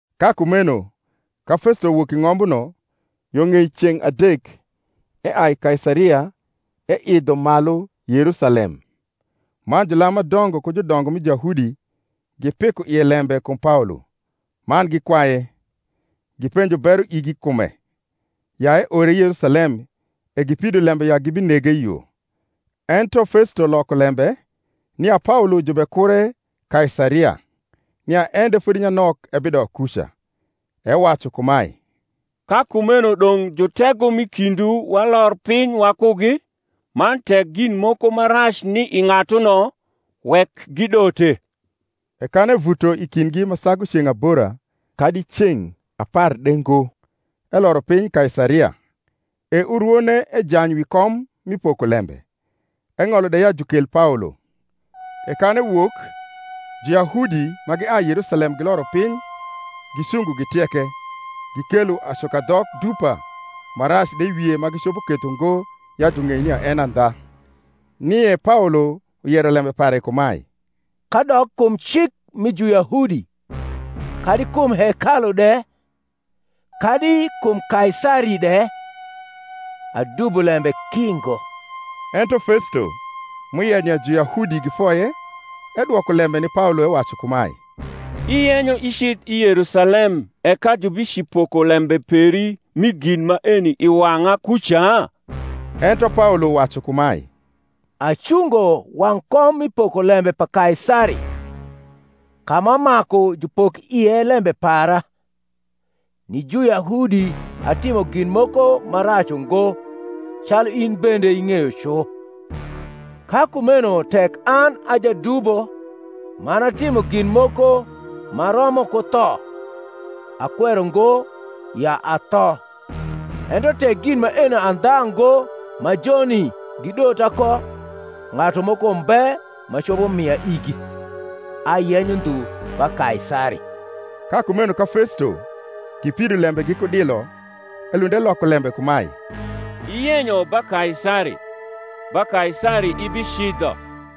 Ka kumeno, ka Festo wok i ng’ombuno, yo ng’ei ceng’ adek eai Kaisaria eidho malu Yerusalcm. Man julam ma dongo ku judongo mi Juyahudi gipiko ie lembe kum Paolo; man gikwaye, gipenjo bero igi i kume, ya eore Yerusalem e gipido lembe ya gibinege i yo. Ento Festo loko lembe, nia Paolo jubekure Kaisaria, nia en de fodi nyanok ebidok kuca. Ewacu kumae, Ka kumeno dong’ jutego m’i kindwu walor piny wakugi, man tek gin moko ma rac ni i ng’atuno, wek gidote. E kan evuto i kindgi ma sagu ceng’ abora kadi ceng’ apar de ngo, eloro piny Kaisaria; e urwone ejany wi kom mi pokolembe, eng’olo de ya jukel Paolo. E kan ewok, Juyahudi ma giai Yerusalem giloro piny gicungo gitieke, gikelo acukadhok dupa ma rac de i wie ma gicopo ketho ngo ya jung’ei nia en e andha; nie Paolo yero lembe pare kumae, Kadok kum cik mi Juyahudi, kadi kum hekalu de, kadi kum Kaisari de, adubo lembe ki ngo. Ento Festo, m’uyenyo ya Juyahudi gifoye, edwoko lembe ni Paolo ewacu kumae, Iyenyo icidh i Yerusalem e ka jubicipoko lembe peri mi gin maeni i wang’a kuca? Ento Paolo wacu kumae, Acungo wang’ kom mi pokolembe pa Kaisari, ka ma maku jupok ie lembe para: ni Juyahudi atimo gin moko ma rac ungo, calu in bende ing’eyo cu. Ka kumeno tek an a jadubo, man atimo gin moko ma romo ku tho, akwero ngo ya atho; ento tek gin maeni andha ngo ma joni gidota ko, ng’atu moko mbe ma copo mia igi. Ayenyo ndhu ba Kaisari. Ka kumeno ka Festo, gipido lembe giku dilo, elund eloko lembe kumae, Iyenyo ba Kaisari: ba Kaisari ibicidho.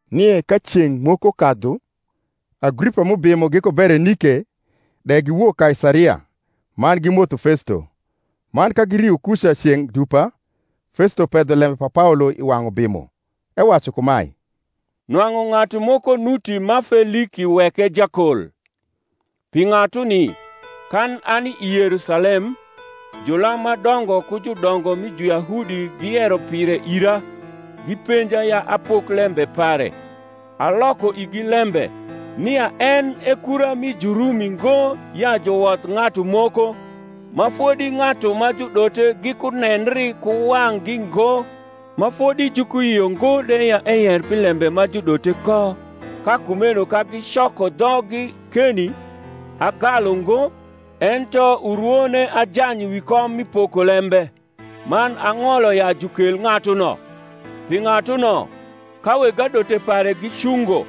Nie ka ceng’ moko kadhu, Agripa m’ubimo giku Berenike de giwok Kaisaria, man gimotho Festo. Man ka girio kuca ceng’ dupa, Festo pedho lembe pa Paolo i wang’ ubimo, ewacu kumae, Nwang’u ng’atu moko nuti ma Feliki weke jakol; pi ng’atuni, kan ani i Yerusalem, julam ma dongo ku judongo mi Juyahudi giyero pire ira, gipenja ya apok lembe pare. Aloko igi lembe, nia en e kura mi Jurumi ngo ya juwodh ng’atu moko, ma fodi ng’atu ma judote gikunendri ku wang’gi ngo, ma fodi jukuyio ngo de ya eyer pi lembe ma judote ko. Ka kumeno ka gicoko dhoggi keni, agalu ngo, ento urwone ajany wi kom mi pokolembe, man ang’olo ya jukel ng’atuno. Pi ng’atuno, ka weg adote pare gicungo,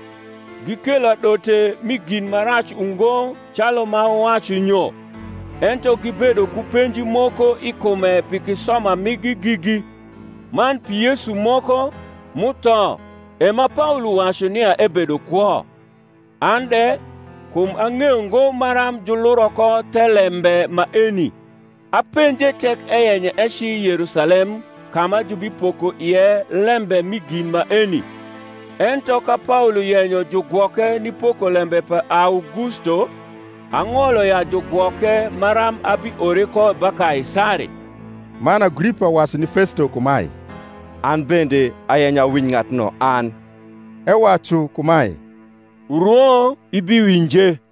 gikelo adote mi gin ma rac ungo calu m’awacu nyo: ento gibedo ku penji moko i kume pi kisoma migi gigi, man pi Yesu moko, m’utho, e ma Paolo wacu nia ebedo kwo. An de, kum ang’eyo ngo maram juluro ko thelembe maeni, apenje tek eyenyo eci Yerusalem ka ma jubipoko ie lembe mi gin maeni. Ento ka Paolo yenyo jugwoke ni pokolembe pa Augusto, ang’olo ya jugwoke maram abiore ko ba Kaisari. Man Agripa wacu ni Festo kumae, An bende ayenyo awinj ng’atuno an. Ewacu kumae, Urwo ibiwinje.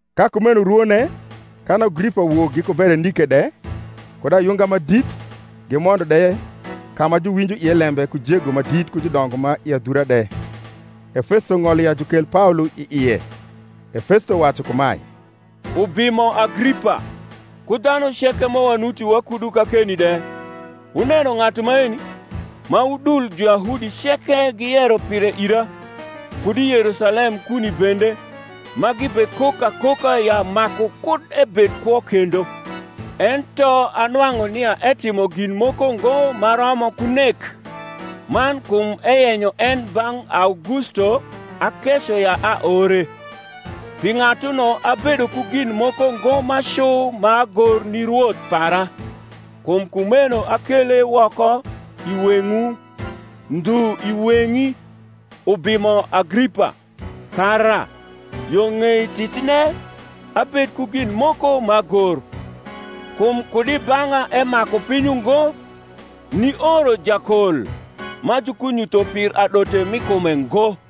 Ka kumeno urwone, kan Agripa wok giku Berenike de, kud ayunga ma dit, gimondo de ka ma juwinjo ie lembe ku jego ma dit ku judongo ma i adhura de, e Festo ng’olo ya jukel Paolo i ie. E Festo wacu kumae, Ubimo Agripa, ku dhanu ceke ma wanuti wakudu kakeni de, wuneno ng’atu maeni, ma udul Juyahudi ceke giyero pire ira, kud i Yerusalem kuni bende, ma gibekok akoka ya maku kud ebed kwo kendo. Ento anwang’u nia etimo gin moko ngo ma romo ku nek: man kum eyenyo en bang’ Augusto akeco ya aore. Pi ng’atuno abedo ku gin moko ngo ma cu m’agor ni rwoth para. Kum kumeno akele woko i weng’wu, ndhu i weng’i, ubimo Agripa, kara, yo ng’ei titine, abed ku gin moko m’agor. Kum kud i bang’a emaku piny ungo, nioro jakol, ma jukunyutho pir adote mi kume ngo.